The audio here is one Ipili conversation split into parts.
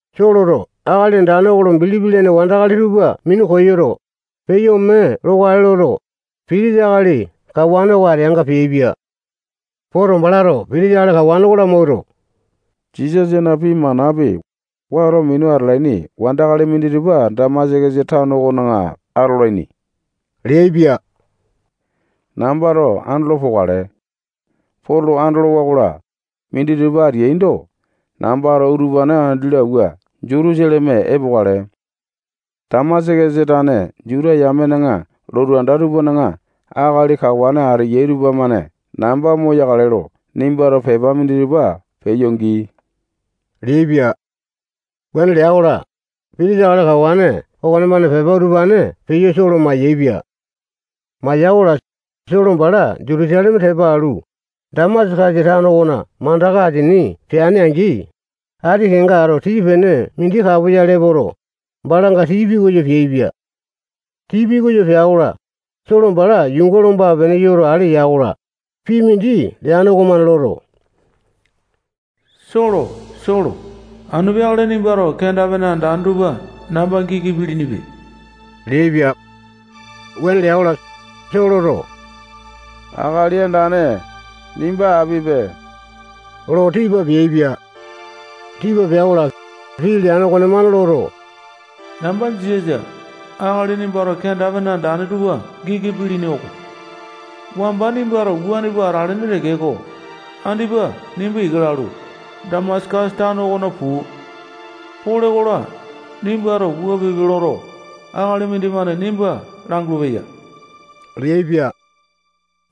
Soloto Akali Andane lo bilipi lene wandakali tupa minu koyoto, peyo ome lokale loto, pitisa akali kawane oko ateanga peaipia. Poto, balato pitisa akali kawane oko lamawuato, Jisasana pii manapi, wato minu atalaini wandakali minditupa Damasakasa tano okona atolaini leaipia. Nambato andolo pokale. Poto andolowa-kola, minditupa ateaindo, nambato utupane andi lo awua Jutusaleme epokale. Damasakasa tane Juta yamena lotu anda tupana akali kawane ateyai tupamane namba moyakale lo nimbato pepa minditupa peyo gii leaipia. Wuane lea-kola, Pitisa akali kawane okonemane pepa utupane peyo Solo mayaepia. Maya-kola, Solo bala Jutusaleme tepa alu, Damasakasa tano okona mandaka asini peane-angi, ati kenga ato tii-pene mindi kapoyale epoto, balanga tii pikoyo peaipia. Tii pikoyo pea-kola, Solo bala yuunga lomba-pene yoto, ale ya-kola, pii mindi leane okomane loto, Solo, Solo, anu peakale nimbato kenda-pene andane tupa namba giki pilinipe leaipia. Wuane lea-kola, Soloto Akali Andane, nimba apipe lo tipa peaipia. Tipa pea-kola, pii leane okonemane loto, namba Jisasa, akali nimbato kenda-pene andane tupa giki pilini oko. Wamba nimbato wuane pua atalene tekeko, andipa nimba ika lalu, Damasakasa tano okona puu. Pole-kola, nimbato wua pipe loto, akali mindimane nimba langulu-peya leaipia.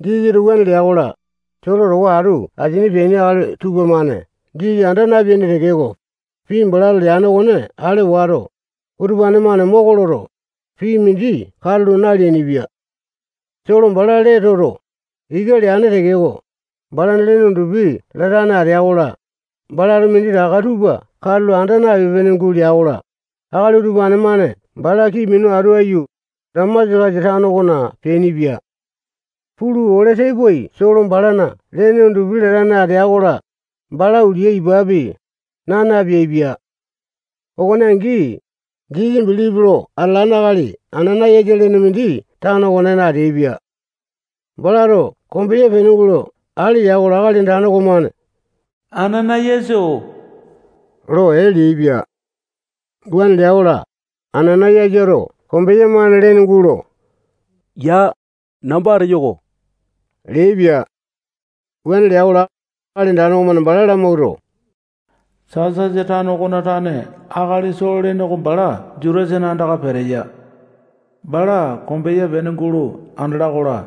Jisasato wuane lea-kola, Solo towa atu asini peaini akali tupamane Jisasa anda napeaini tekeko, pii balato leane okone ale wato, utupane-mane moko loto, pii mindi katulo naleainipia. Solo bala lee toto, ika leane tekeko, balana lene undupi latane atea-kola, balato minditaka tupa katulo anda napipe-pene gulea-kola, akali utupane-mane bala kii minu atu aiyu, Damasakasa tano okona peainipia. Pulu, ole tepoai Solo balana lene undupi latane atea-kola, bala ulia ipapi, naa napeaipia. Okone angi, Jisasa bilipi lo atalane akali Anana-yasa lene mindi tano okonena ateaipia. Balato kombeya pene gulo ale ya-kola, Akali Andane okomane Anana-yasa-oo lo ee leaipia. Wuane lea-kola, Anana-yasato kombeya-mane lene gulo yaa, namba ateyo oko leaipia. Wuane lea-kola, Akali Andane okomane bala lamawuato, Tasasa tano okona tane akali Solo lene oko bala Jutasana andaka peteya. Balato kombeya pene gulo andala-kola,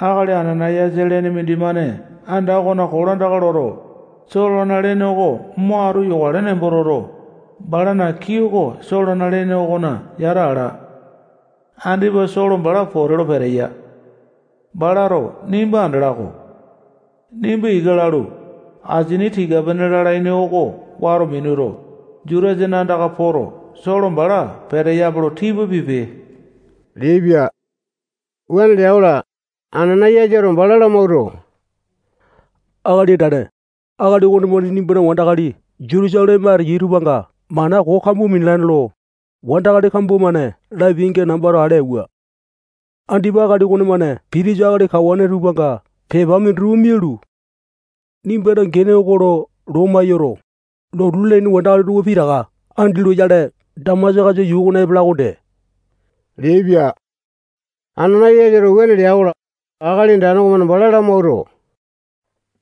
akali Anana-yasa lene mindimane anda okona kolandaka loto, Solona lene oko mo atu yokale nembo toto, balana kii oko Solona lene okona yata ala. Andipa Solo bala pote lo peteya. Balato nimba andala-ko. Nimba ika lalu, asini tika-pene lalaini oko wato minuto, Jutasana andaka poto, Solo bala peteyape lo tipa pipe leaipia. Wuane lea-kola, Anana-yasato bala lamawuato, Akali Andane, akali okonemane nimbana wandakali Jutusaleme ateya tupanga mana koo kambua minalane lo, wandakali kambua-mane lapiainga nambato ale auwa. Andipa akali okonemane pitisa akali kawane tupanga pepa minditupa mialu, nimbana gene oko lo loma yoto, lotu lalaini wandakali tupa pitaka andi loyale Damasakasa yuu okona epala okonde leaipia. Anana-yasato wuane lea-kola, Akali Andane okomane bala lamawuato,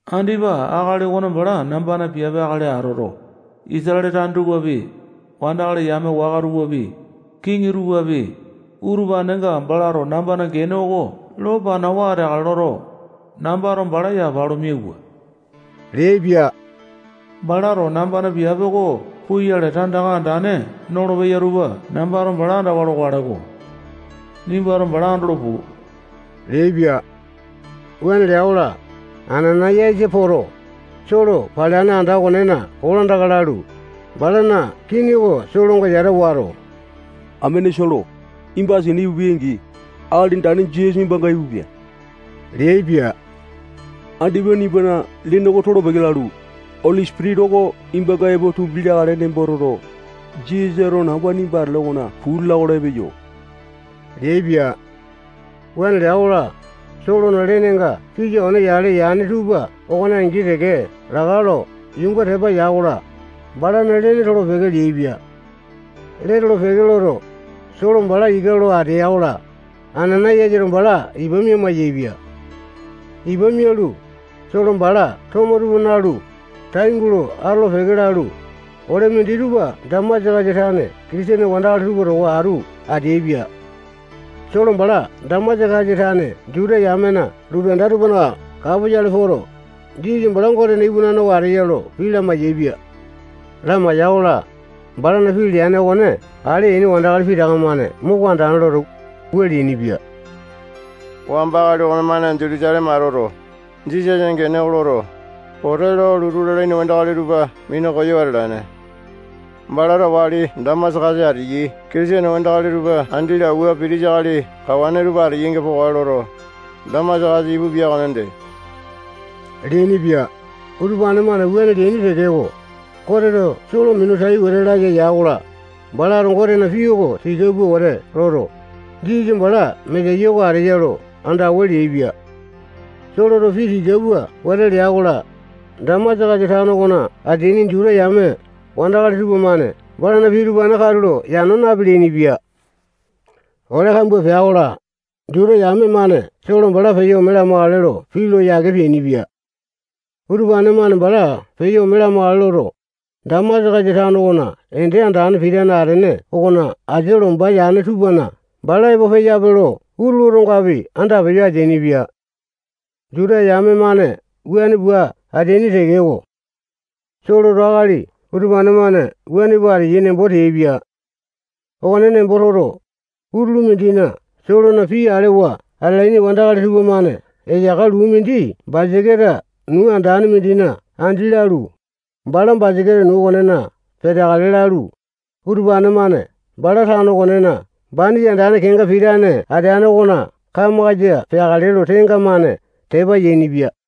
andipa akali okone bala nambana piape akali atoto, Isatale tane tupapi, wandakali yame waka tupapi, kiŋi tupapi, utupanenga balato nambana gene oko lo panawa ateakale loto, nambato bala yapa lo miauwa leaipia. Balato nambana piape oko puyale tandaka andane nolopeya tupa nambato bala andawa lokale-ko. Nimbato bala andolo puu leaipia. Wuane lea-kola, Anana-yasa poto, Solo paleane anda okonena kolandaka lalu, balana kini oko Solonga yata wato, amene Solo, nimba asini ipupi-angi, Akali Andane Jisasa nimbanga ipupia leaipia. Andipa nimbana lene oko tolo-peke lalu, Oli Sipitisa oko nimbanga epo tumbi leakale nembo toto, Jisasato namba nimba atele okona puu lala-kola, epeyo leaipia. Wuane lea-kola, Solona lenenga pisa one yale yane tupa okone angi teke laka lo yuunga tepa ya-kola, balana lee tolo-peke leaipia. Lee tolo-peke loto, Solo bala ika lo atea-kola, Anana-yasato bala ipa mia-maiyaepia. Ipa mialu, Solo bala tomo tupa nalu, tai gulo atolo-peke lalu, ole minditupa bala Damasakasa tane Kitisene wandakali tupa towa atu ateaipia. Solo bala Damasakasa tane Juta yamena lotu anda tupana kapoyale poto, Jisasa bala Gotena iwanane oko ateya lo pii lamai-yaepia. Lamaiya-kola, balana pii leane okone ale yaini wandakali pitaka-mane moko andane loto, wua leainipia: Wamba akali okonemane Jutusaleme atoto, Jisasana gene oko loto, pote lo lotu lalaini wandakali tupa minu koyo atalane. Balato wali Damasakasa ateyai Kitisene wandakali tupa andi lo awua pitisa akali kawane tupa ateyainga pokale loto, Damasakasa ipupia okonde leainipia. Utupane-mane wuane leaini tekeko, Goteto Solo minu tai wete laya ya-kola, balato Gotena pii oko tika pua wete loto, Jisasa bala Mesaya oko ateya lo andawa leaipia. Soloto pii tika pua wete lea-kola, Damasakasa tano okona ateaini Juta yame wandakali tupamane balana pii utupane katulo yano napeleaini-pia. Ole kambua pea-kola, Juta yame-mane Solo bala peyo ome lamakale lo pii lo yake peainipia. Utupane-mane bala peyo ome lamakale loto, Damasakasa tano okona ende andane pitane atene okona asia lomba yane tupana bala epo peyape lo utulu otongapi andapeyo ateainipia. Juta yame-mane wuane pua ateaini tekeko, Soloto akali utupane-mane wuane pua ateyai nembo teaipia. Okone nembo toto, utulu mindina Solona pii alewa atalaini wandakali tupamane eyaka luu mindi basaketa nuu andane mindina andi lalu, bala basaketa okonena Bala peteakale lalu, utupane-mane bala tano okonena banisa andane kenga pitane ateane okona kamakasa peakale lo tenga-mane tepa yainipia.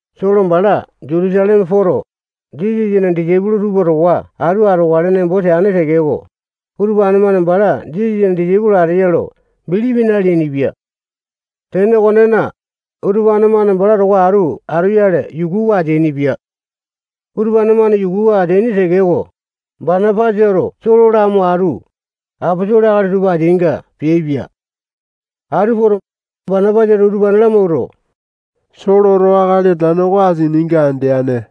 Solo bala Jutusaleme poto, Jisasana disaipolo tupa towa atu atokale nembo teane tekeko, utupane-mane bala Jisasana disaipolo ateya lo bilipi naleainipia. Tene okonena, utupane-mane bala towa atu atoyale yukuwa ateainipia. Utupane-mane yukuwa ateaini tekeko, Banapasato Solo lamo atu, aposolo akali tupa ateainga peaipia. Atu poto, Banapasato utupane lamawuato, Soloto Akali Andane oko asininga andeane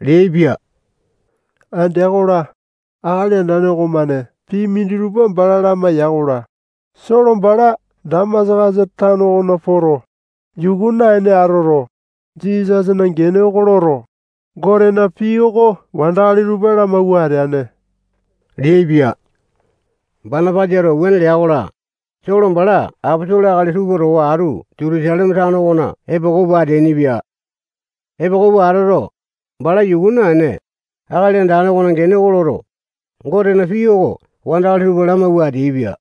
leaipia. Andea-kola, Akali Andane okomane pii minditupa bala lamaiya-kola, Solo bala Damasakasa tano okona poto, yuku naene atoto, Jisasana gene oko loto, Gotena pii oko wandakali tupa lamawua ateane leaipia. Banapasato wuane leai-kola, Solo bala aposolo akali tupa towa atu Jutusaleme tano okona epoko pua ateainipia. Epoko pua atoto, bala yuku naene, Akali Andane okona gene oko loto, Gotena pii oko wandakali tupa lamawua ateaipia.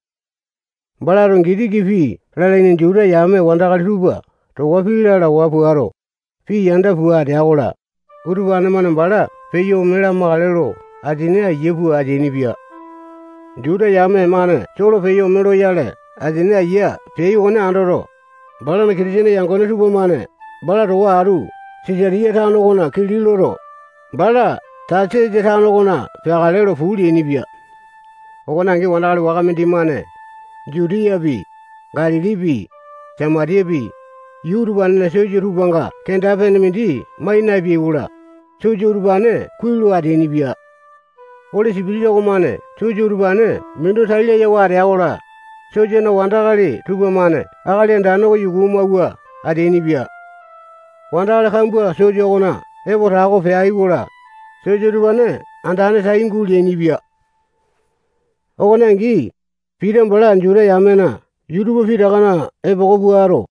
Balato Gitiki pii lalaini Juta yame wandakali tupa towa pii lalawa puato, pii yanda pua atea-kola, utupane-mane bala peyo ome lamakale lo asini aiya pua ateainipia. Juta yame-mane Solo peyo ome loyale asini aiya peai okone andoto, balana Kitisene yangone tupamane bala towa atu Sisatiya tano okona kili loto, bala Tasasa tano okona peakale lo puu leainipia. Okone angi, wandakali waka mindimane Jutiyapi, Galilipi, Samatiyapi, yuu utupanena sosa tupanga kenda-pene mindi mai napeai-kola, sosa utupane kuai lo ateainipia. Oli Sipitisa okomane sosa utupane minu tai layawa atea-kola, sosana wandakali tupamane Akali Andane oko yuku amawua ateainipia. Wandakali kambua sosa okona epo tako peai-kola, sosa utupane andane tai guleainipia. Okone angi, Pita bala Juta yamena yuu tupa pitakana epoko puato,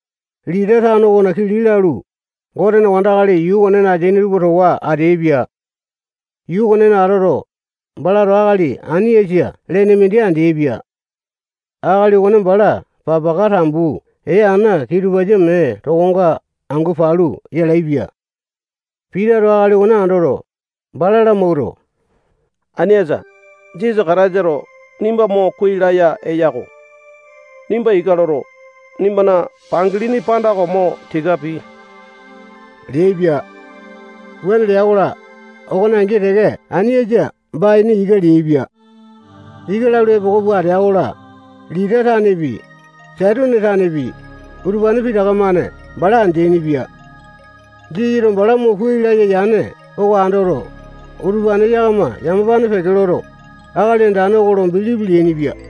Lita tano okona kili lalu, Gotena wandakali yuu okonena ateaini tupa towa ateaipia. Yuu okonena atoto, balato akali Ainiasa lene mindi andeaipia. Akali okone bala papaka tambu ee ana kitupasa mee tokonga angu palu yalaepia. Pitato akali okone andoto, bala lamawuato, Ainiasa, Jisasa Kataisato nimba mo kuai laya eya-ko. Nimba ika loto, nimbana pangalini panda oko mo tika pii leaipia. Wuane lea-kola, okone angi teke Ainiasa baini ika leaipia. Ika lalu, epoko pua atea-kola, Lita tanepi, Setone tanepi, utupane pitaka-mane bala andeaini-pia. Jisasato bala mo kuai laya yane oko andoto, utupane yakama yamapane peke loto, Akali Andane oko lo bilipi leainipia.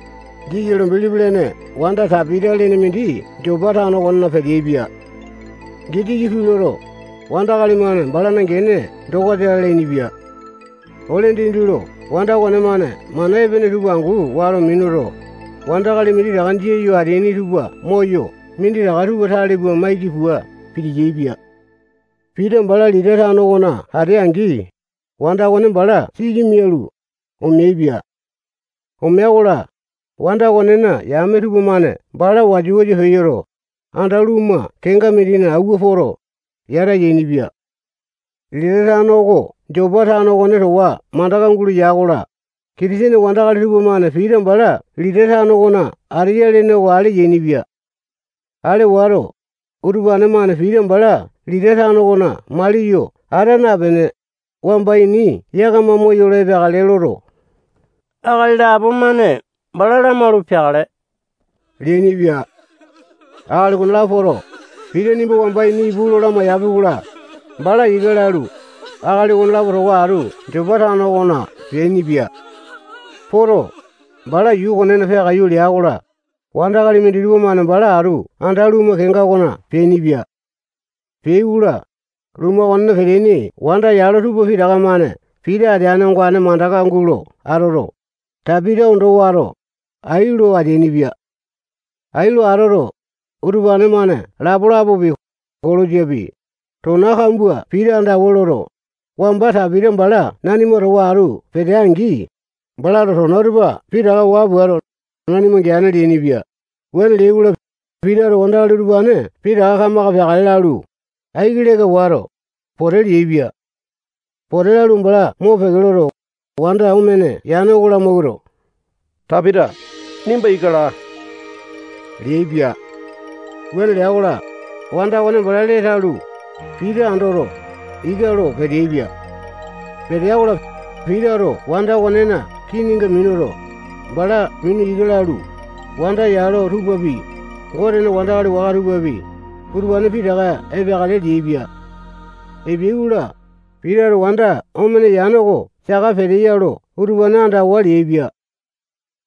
Jisasa lo bilipi lene wanda Tapita lene mindi Jopa tano okona peteaipia. Gitiki pii loto, wandakali-mane balana gene Dokasa lalainipia. Ole dindi lo wanda okonemane mana epene tupa angu wato minuto, wandakali minditaka jia yo ateaini tupa moyo minditaka tupa tale pua maiki pua piti-yaepia. Pita bala Lita tano okona atea-angi, wanda okone bala siki mialu, omeaipia. Omea-kola, wanda okonena yame tupamane bala wasa-wasa peyoto, anda lumu kenga mindina awua poto, yata yainipia. Lita tano oko Jopa tano okone towa mandaka gulo ya-kola, Kitisene wandakali tupamane Pita bala Lita tano okona ateya lene oko ale yainipia. Ale wato, utupane-mane Pita bala Lita tano okona maliyo ata napene, wamba ini yakama moyolo epeakale loto, akali lapo-mane bala lamaulu peakale leainipia. Akali okonelapo poto, Pita nimba wamba ini ipu lo lamaiyapi-kola, bala ika lalu, akali okonelapo towa atu Jopa tano okona peainipia. Poto, bala yuu okonena peakaiyu lea-kola, wandakali minditupa-mane bala atu anda lumu kenga okona peainipia. Peai-kola, lumu okonena peteaini wanda yalo tupa pitaka-mane Pita ateane ongane mandaka gulo atoto, Tapita ondo wato, ai lo ateainipia. Ai lo atoto, utupane-mane lapalapapi, kolosapi, tona kambua Pita andawa loto, wamba Tapita bala nanima towa atu petea-angi, balato tona utupa pitaka waa puato, nanima geane leainipia. Wuane leai-kola, Pitato wandakali utupane pitaka kamaka peakale lalu, aiki leka wato, pote leaipia. Pote lalu, bala mopeke loto, wanda omene yane oko lamawuato, Tapita, nimba ika laa leaipia. Wuane lea-kola, wanda okone bala lee talu, Pita andoto, ika lo peteaipia. Petea-kola, Pitato wanda okonena kininga minuto, bala mina ika lalu, wanda yalo tupapi, Gotena wandakali waka tupapi, utupane pitaka epeakale leaipia. Epeai-kola, Pitato wanda omene yane oko saka peteya lo utupane andawa leaipia.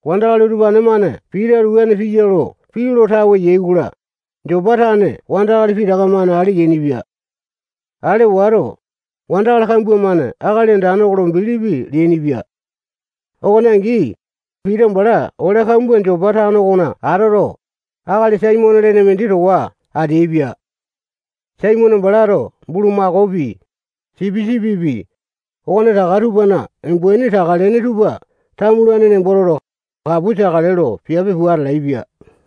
Wandakali utupane-mane Pitato wuane piya lo pii lo tawe yai-kola, Jopa tane wandakali pitaka-mane ale yainipia. Ale wato, wandakali kambua-mane Akali Andane oko lo bilipi leainipia. Okone angi, Pita bala ole kambua Jopa tano okona atoto, akali Saimone lene mindi towa ateaipia. Saimone balato bulumakaopi, sipisipipi, okonetaka tupana umbaini taka-lene tupa tamulane nembo toto, kapu teakale lo piape pua atalaepia.